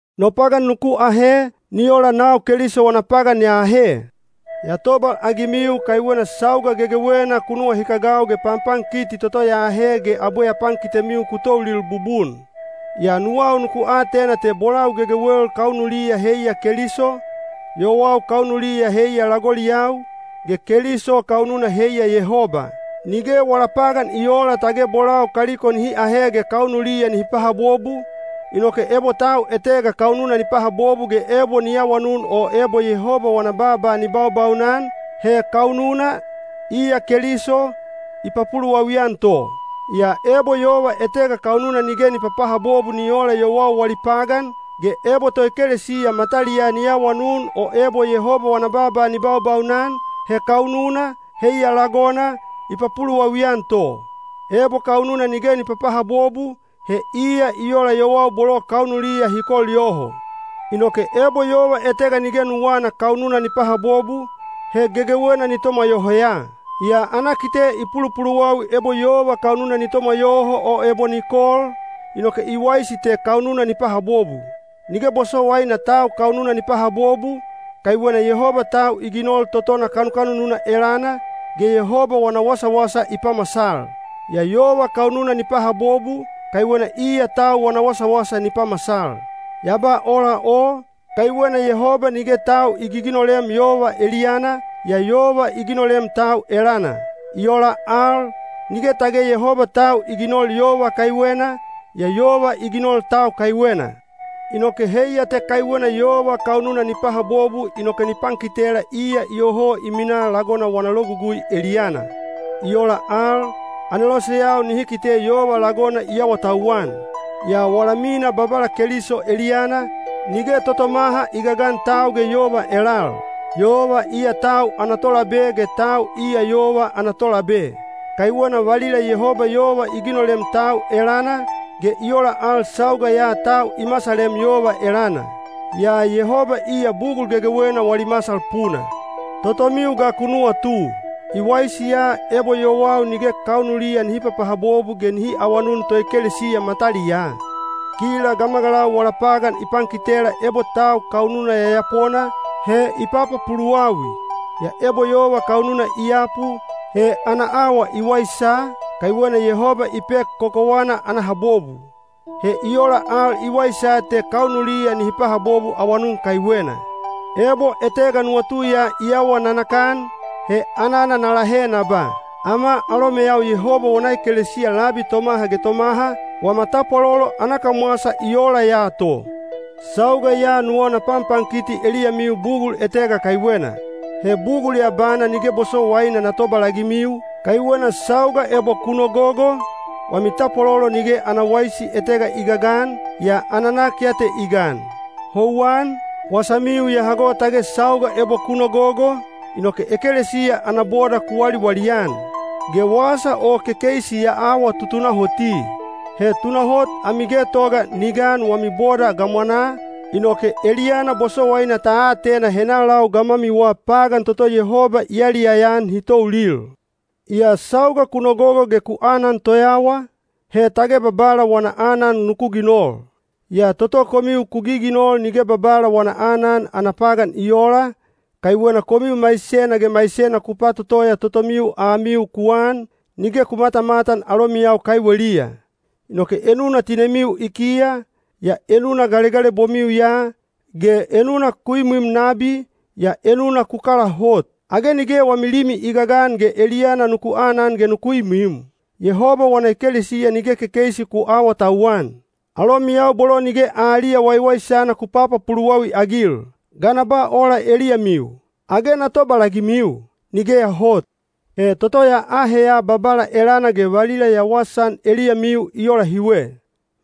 No pagan nuku ahe, ni ola nau Keliso wana pagan ya ahe. Ya tobalagimiu kaiwena sauga gegewena ku nuwahikagau ge panpankiti toto ya ahe ge abwe ya pankitemiu ku toulil bubun. Yaa nuwau nuku atena te bolau gegewel kaunuliya heiya Keliso, yowau kaunuliya heiya lagoliyau, ge Keliso kaununa heiya Yehoba. Nige wala pagan i oola tage bolau kaliko nihi ahe ge kaunuliya nihi pahabobu, inoke ebo tau etega kaununa ni pahabobu ge ebo ni awanun o ebo Yehoba wana baaba ni baubaunan, he kaununa, iya Keliso, i papuluwawi-an to. Yaa ebo yova etega kaununa nige ni papahabobu ni oola yowau wali pagan, ge ebo toekelesiya mataliyaa ni awanun o ebo Yehoba wana baaba ni baubaunan, he kaununa, heiya lagona, i papuluwawi-an to. Ebo kaununa nige ni papahabobu, he iya i ola yowau bolo kaunuliya hi kol yoho. Inoke ebo yova etega nige nuwana kaununa ni pahabobu, he gegewena ni tomwa yoho ya! Yaa ana kite i pulupuluwawi ebo yova kaununa ni tomwa yoho o ebo ni kol, inoke i waisi te kaununa ni pahabobu. Nige bosowaina tau kaununa ni pahabobu, kaiwena Yehoba tau i ginol totona kanukanununa elana, ge Yehoba wana wasawasa i pamasal. Yaa yova kaununa ni pahabobu, kaiwena iya tau wana wasawasa ni pamasal. Ya ba ola o, kaiwena Yehoba nige tau i giginolem yova eliyana, yaa yova i ginolem tau elana. I ola al, nige tage Yehoba tau i ginol yova kaiwena, yaa yova i ginol tau kaiwena. Inoke heiya te kaiwena yova kaununa ni pahabobu inoke ni pankitela iya iyoho i minaa lagona wana logugui eliyana. I ola al, aneloseyau nihi kite yova lagona i awatauwan. Yaa wala mina Babala Keliso eliyana, nige totomaha i gagan tau ge yova elal. Yova iya tau ana tolabe ge tau iya yova ana tolabe. Kaiwena valila Yehoba yova i ginolem tau elana, ge i ola al sauga ya tau i masalem yova elana. Yaa Yehoba iya bugul gegewena wali masal puna. Totomiu ga ku nuwatu. I waisi ya ebo yowau nige kaunuliya nihi papahabobu ge nihi awanun toekelesiya mataliyaa? Kila gamagalau wala pagan i pankitela ebo tau kaununa yayapona, he i papapuluwawi. Yaa ebo yova kaununa i yapu, he ana awa i waisa, kaiwena Yehoba i pek kokowana ana habobu. He i ola al i waisa te kaunuliya nihi pahabobu awanun kaiwena. Ebo etega nuwatu ya ni awa nanakan, he anana na lahe na ba, “Ama alomeyau Yehoba wana ekelesiya labi tomaha ge tomaha, wama tapwalolo ana kamwasa i ola ya to.” Sauga ya nuwau na panpankiti eliyamiu bugul etega kaiwena. He bugul ya bana nige bosowaina na tobalagimiu, kaiwena sauga ebo ku nogogo, wami tapwalolo nige ana waisi etega i gagan, yaa ana nak ya te i gan. Houwan, wasamiu ya hago tage sauga ebo ku nogogo, inoke ekelesiya ana boda ku waliwali-an. Ge wasa o kekeisi ya awa tutunahoti. He tunahot ami getoga ni gan wami boda gamwanaa, inoke eliyana bosowaina ta atena henalau gamwamiwa pagan toto Yehoba i yaliyaya-an hi toulil. Yaa sauga ku nogogo ge ku anan toyawa, he tage Babala wana aanan nuku ginol. Yaa toto komiu ku giginol nige Babala wana aanan ana pagan i oola, kaiwena komiu maisena ge maisena ku patotoya totomiu amiu ku an, nige ku matamatan alomiyau kaiweliya. Inoke enuna tinemiu i kiya, yaa enuna galegalebomiu ya, ge enuna ku imwim nabi, yaa enuna ku kala hot. Age nige wami limi i gagan ge eliyana nuku anan ge nuku imwim? Yehoba wana ekelesiya nige kekeisi ku aawatauwan! Alomiyau bolo nige aliya waiwaisana ku papapuluwawi-agil! Ga na ba ola eliyamiu? Age na tobalagimiu? Nigeya hot! He toto ya aheya Babala elana ge valila ya wasaan eliyamiu i ola hiwe.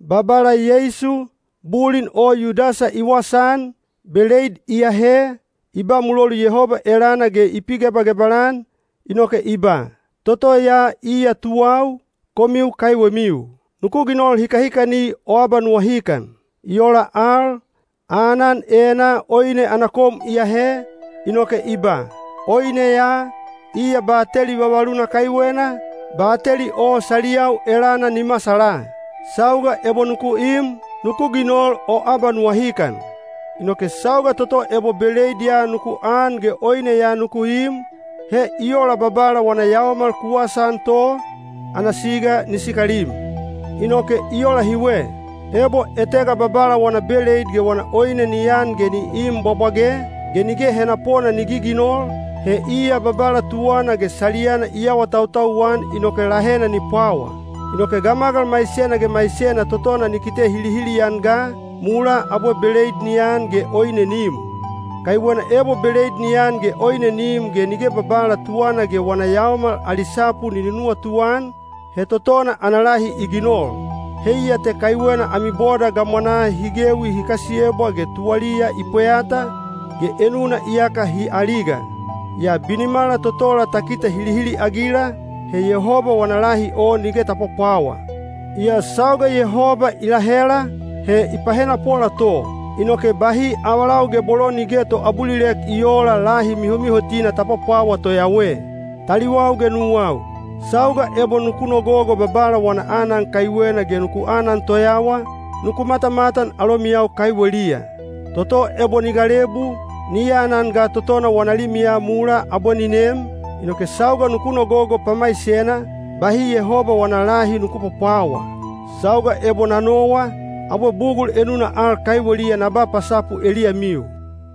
Babala Yeisu, bulin o Yudasa i wasaan, beleid i ahe, i ba mulolu Yehoba elana ge i pigebagebal-an, inoke i ba, “Toto ya iya tuwau, komiu kaiwemiu. Nuku ginol hikahikani o abanuwahikan.” I ola al, aanan enaa oine ana kom i ahe, inoke i ba, “Oine ya, iya bateli vavaluna kaiwena, bateli o saliyau elana ni masala. Sauga ebo nuku im, nuku ginol o abanuwahikan.” Inoke sauga toto ebo beleid ya nuku an ge oine ya nuku im, he i ola Babala wana yaomal ku wasaan to, ana siga ni sikalim. Inoke i ola hiwe: ebo etega Babala wana beleid ge wana oine ni an ge ni im bwabwage, ge nige henapona ni giginol, he iya Babala tuwana ge saliyana i awatautau-an inoke lahena ni pwawa. Inoke gamagal maisena ge maisena totona ni kite hilihili-an ga, mulaa abwe beleid ni an ge oine ni im. Kaiwena ebo beleid ni an ge oine ni im ge nige Babala tuwana ge wana yaomal ali sapu ni nunuwatu-an, he totona ana lahi i ginol. Heiya te kaiwena ami boda gamwanaa hi gewi hi kasiyebwa ge tuwaliya i pweyata, ge enuna iyaka hi aliga. Yaa binimala totola ta kite hilihili-agila, he Yehoba wana lahi o nige ta pwapwawa. Yaa sauga Yehoba i lahela, he i pahenapola to, inoke bahi avalau ge bolo nige toabulilek i oola lahi mihomihotina ta pwapwawa toyawe. Taliwau ge nuwau, sauga ebo nuku nogogo Babala wana aanan kaiwena ge nuku anan toyawa, nuku matamatan alomiyau kaiweliya. Toto ebo ni galebu, ni anan ga totona wana limiya mulaa abwe ni nem, inoke sauga nuku nogogo pamaisena, bahi Yehoba wana lahi nuku pwapwawa. Sauga ebo na nowa, abwe bugul enuna al kaiweliya na ba pasapu eliyamiu.